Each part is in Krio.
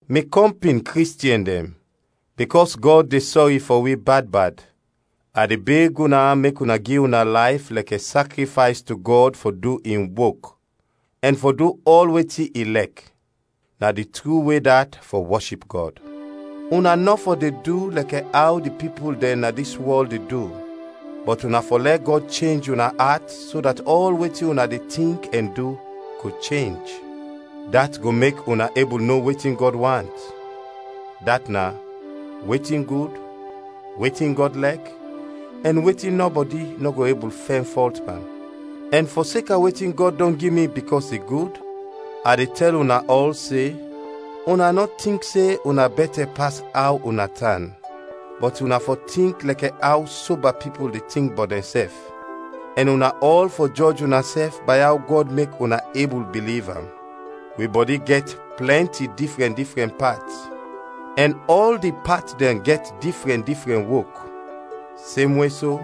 Mi kɔmpin Kristiɛn dɛn, bikɔs Gɔd de sɔri fɔ wi bad bad, a de beg una mek una gi una layf lɛkɛ sakrifays to Gɔd fɔ du in wok, ɛn fɔ du ɔl wetin i lɛk; na di tru we dat fɔ wɔship Gɔd. Una nɔ fɔ de du lɛkɛ aw di pipul dɛn na dis wɔl de du, bɔt una fɔ lɛ Gɔd chenj una at so dat ɔl wetin una de tink ɛn du go chenj. Dat go mek una ebul no wetin Gɔd want; dat na: wetin gud, wetin Gɔd lɛk, ɛn wetin nɔbɔdi nɔ go ebul fɛn fɔlt pan. Ɛn fɔseka wetin Gɔd dɔn gi mi bikɔs i gud, a de tɛl una ɔl se: Una nɔ tink se una bɛtɛ pas aw una tan, bɔt una fɔ tink lɛkɛ aw soba pipul de tink bɔt dɛnsɛf, ɛn una ɔl fɔ jɔj unasɛf bay aw Gɔd mek una ebul biliv am. Wi bɔdi gɛt plɛnti difrɛn difrɛn pat, ɛn ɔl di pat dɛn gɛt difrɛn difrɛn wok. Semwe so,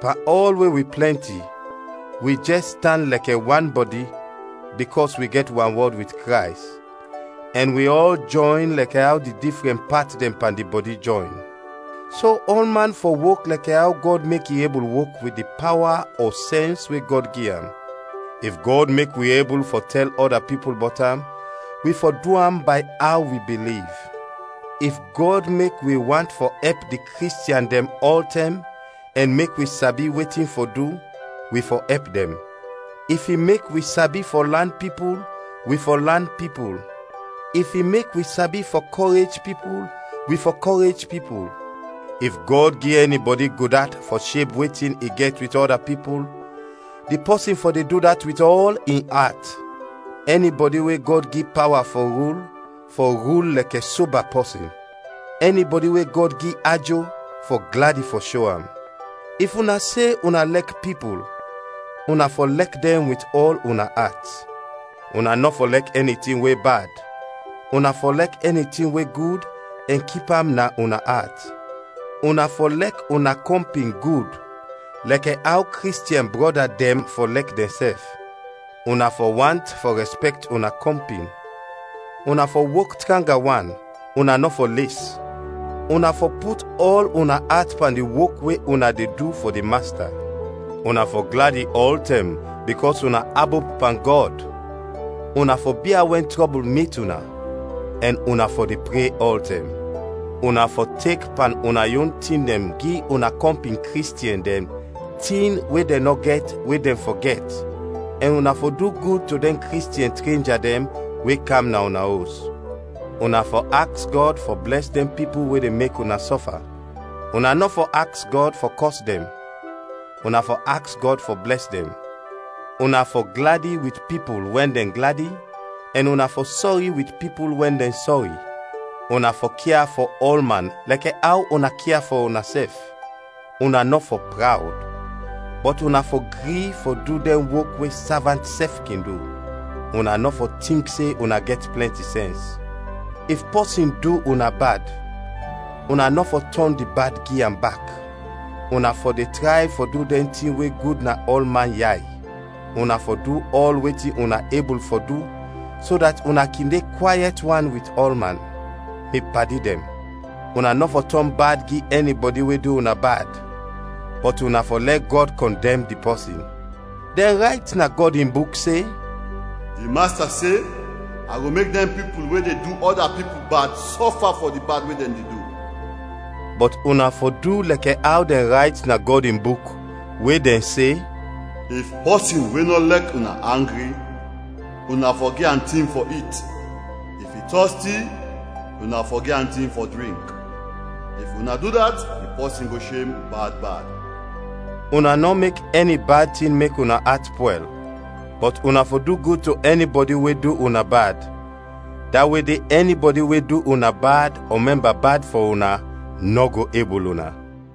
pan ɔl we wi plɛnti, wi jɛs tan lɛkɛ wan bɔdi bikɔs wi gɛt wanwɔd wit Krays, ɛn wi ɔl jɔyn lɛkɛ aw di difrɛn pat dɛn pan di bɔdi jɔyn. So ɔlman fɔ wok lɛkɛ aw Gɔd mek i ebul wok wit di pawa ɔ sɛns we Gɔd gi am. If Gɔd mek wi ebul fɔ tɛl ɔda pipul bɔt am, wi fɔ du am bay aw wi biliv. If Gɔd mek wi want fɔ ɛp di Kristiɛn dɛn ɔltɛm ɛn mek wi sabi wetin fɔ du, wi fɔ ɛp dɛn. If i mek wi sabi fɔ lan pipul, wi fɔ lan pipul. If i mek wi sabi fɔ kɔrej pipul, wi fɔ kɔrej pipul. If Gɔd gi ɛnibɔdi gudat fɔ sheb wetin i gɛt wit ɔda pipul, di pɔsin fɔ de du dat wit ɔl in at; ɛnibɔdi we Gɔd gi pawa fɔ rul, fɔ rul lɛkɛ soba pɔsin; ɛnibɔdi we Gɔd gi ajo, fɔ gladi fɔ sho am. If una se una lɛk pipul una fɔ lɛk dɛn wit ɔl una at. Una nɔ fɔ lɛk ɛni tin we bad, una fɔ lɛk ɛni tin we gud ɛn kip am na una at. Una fɔ lɛk una kɔmpin gud, lɛkɛ aw Kristiɛn brɔda dɛn fɔ lɛk dɛnsɛf; una fɔ want fɔ rɛspɛkt una kɔmpin. Una fɔ wok tranga wan, una nɔ fɔ les. Una fɔ put ɔl una at pan di wok we una de du fɔ di Masta. Una fɔ gladi ɔltɛm bikɔs una abop pan Gɔd, una fɔ bia wɛn trɔbul mit una; ɛn una fɔ de pre ɔltɛm. Una fɔ tek pan una yon tin dɛn gi una kɔmpin Kristiɛn dɛn tin we dɛn nɔ gɛt we dɛn fɔ gɛt, ɛn una fɔ du gud to dɛn Kristiɛn trenja dɛn we kam na una os. Una fɔ aks Gɔd fɔ blɛs dɛn pipul we de mek una sɔfa; una nɔ fɔ aks Gɔd fɔ kɔs dɛn, una fɔ aks Gɔd fɔ blɛs dɛn. Una fɔ gladi wit pipul wɛn dɛn gladi, ɛn una fɔ sɔri wit pipul wɛn dɛn sɔri. Una fɔ kia fɔ ɔlman lɛkɛ aw una kia fɔ unasɛf. Una nɔ fɔ prawd, bɔt una fɔ gri fɔ du dɛn wok we savant sɛf kin du. Una nɔ fɔ tink se una gɛt plɛnti sɛns. If pɔsin du una bad, una nɔ fɔ tɔn di bad gi am bak. Una fɔ de tray fɔ du dɛn tin we gud na ɔlman yay. Una fɔ du ɔl wetin una ebul fɔ du so dat una kin de kwayɛt wan wit ɔlman. Mi padi dɛn, una nɔ fɔ tɔn bad gi ɛnibɔdi we du una bad, bɔt una fɔ lɛ Gɔd kɔndɛm di pɔsin. Dɛn rayt na Gɔd in Buk se, “Di Masta se, a go mek dɛn pipul we de du ɔda pipul bad, sɔfa fɔ di bad we dɛn de du.” Bɔt una fɔ du lɛkɛ aw dɛn rayt na Gɔd in Buk, we dɛn se, “If pɔsin we nɔ lɛk una, angri, una fɔ gi am tin fɔ it; if i tɔsti, una fɔ gi am tin fɔ drink. If una du dat, di pɔsin go shem bad bad.” Una nɔ mek ɛni bad tin mek una at pwɛl, bɔt una fɔ du gud to ɛnibɔdi we du una bad, da we de ɛnibɔdi we du una bad ɔ mɛmba bad fɔ una, nɔ go ebul una.